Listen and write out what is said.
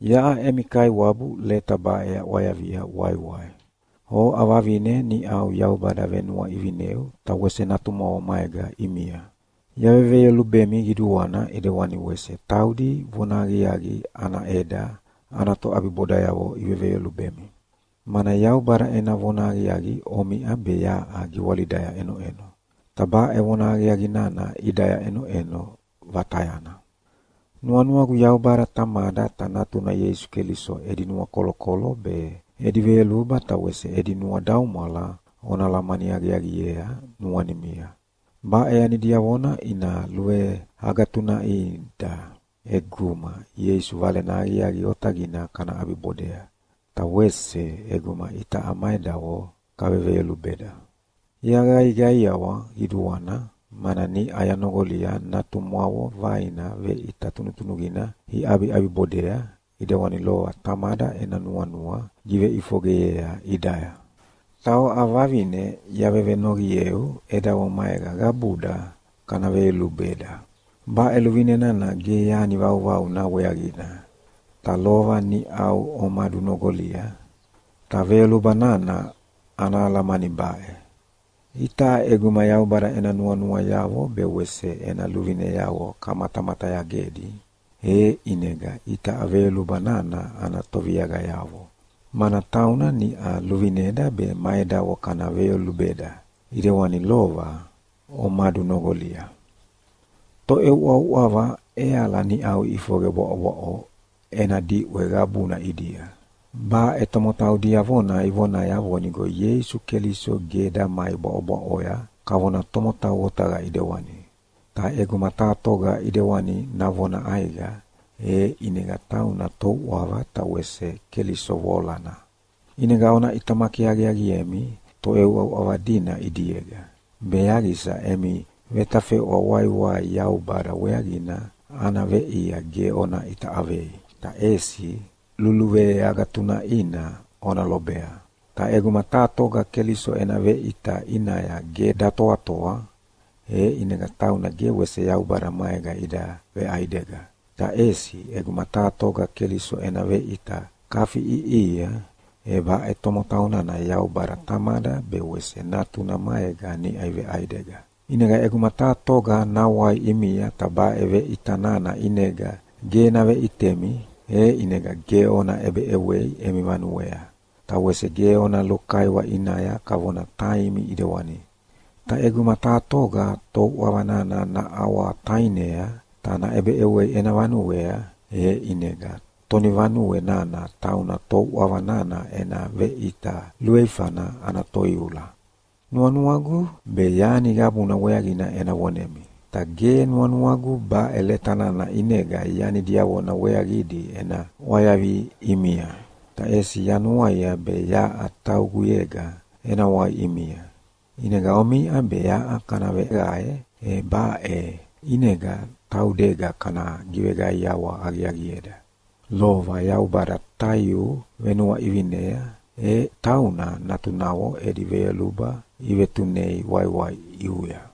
Yaʼa emi kaiwabu leta baʼe yaʼwayavia waiwai, oʼa Vavine niʼau Yaubada venuaʼivineu ta wese natumwavo maega ʼimia. Yaveveyolubemi qiduana ʼedewani wese taudi vonahaqiaqi ana ʼeda ana toʼabibodayavo iveveyolubemi, mana Yaubada ena vonahaqiaqi omiʼa be yaʼa giwalidaya ʼenoʼeno, ta baʼe vonahaqiaqi nana ʼidaya ʼenoʼeno vatayana. Nuanuagu Yaubada Tamada ta Natuna Ieisu Keliso edi nuakolokolo be edi veyoluba ta wese edi nuadaumwala ona alamani aqiaqiea nuanimia. Baʼe yani diavona ina luveagatunaʼida ʼeguma Ieisu Valena Aqiaqi Otaqina kana ʼabibodea, ta wese ʼeguma itaʼa ma edavo kaveveyolubeda. Yaqaiqaiawa qiduana, mana niʼa yanoqolia natumwavo vaina veʼita tunutunuqina iʼabiʼabibodea, ʼidewani lova Tamada ena nuanua giveʼifoqeyea ʼidaya. Ta oʼa Vavine yavevenoqieu edavo maega qabuda kana veyolubeda! Baʼe luvine nana ge yani vauvauna weaqina, ta lova niʼau omadunoqolia. Ta veyoluba nana ana alamani baʼe: Itaʼa ʼeguma Yaubada ena nuanuayavo be wese ena luvineavo kamatamatayagedi, e ʼinega itaʼa veyoluba nana ana toviaqayavo, mana tauna niʼa luvineda be ma edavo kana veyolubeda, ʼidewani lova omadunoqolia. Toʼeuʼauʼava ʼeala niʼau iʼifoqe bwaʼobwaʼo ena diʼwe qabuna ʼidia. Baʼe tomotau diavona ivonaya vonigo Ieisu Keliso ge damai bwaʼobwaʼoya kavona tomotau otaqa ʼedewani. Ta ʼeguma taha toga ʼedewani navona ʼaiqa, e ʼinega tauna touʼava ta wese Keliso voalana. ʼInega ona ʼitamaki aqiaqiemi toʼeuʼauʼava dina ʼidiega, be yaqisa emi vetafeʼwa waiwai Yaubada weaqina ana veʼia ge ona ʼita ʼavei, ta ʼesi luluveagatunaʼina ona lobea. Ta ʼeguma taha toga Keliso ena veʼita ʼinaya ge datoatoa, e ʼinega taunana ge wese Yaubada maega ida veʼaidega. Ta ʼesi ʼeguma taha toga Keliso ena veʼita kafiʼiʼihia, e baʼe tomotau nana Yaubada Tamada be wese Natuna maega niʼa iveʼaidega. ʼInega ʼeguma taha toga nawai ʼimia ta baʼe veʼita nana ʼinega ge naveʼitemi, e ʼinega ge ona ʼebeʼewei emi vanuea, ta wese ge ona lukaiwa ʼinaya kavona taimi ʼidewani. Ta ʼeguma taha toga touʼava nana naʼawatainea ta naʼebeʼewea ena vanuea, e ʼinega tonivanue nana tauna touʼava nana ena veʼita luveifana ana toiula. Nuanuagu be yani qabuna weaqina ena vonemi, ta ge nuanuagu baʼe leta nana ʼinega yani diavona weaqidi ena ʼwayavi ʼimia, ta ʼesi yanuaia be yaʼa tauguyega ena wai ʼimia. ʼInega omiʼa be yaʼa kana veqae, e baʼe ʼinega taudega kana giveqaiawa aqiaqieda. Lova Yaubada taiu venuaʼivinea e tauna natunavo edi veyoluba ivetunei waiwai ʼiuya.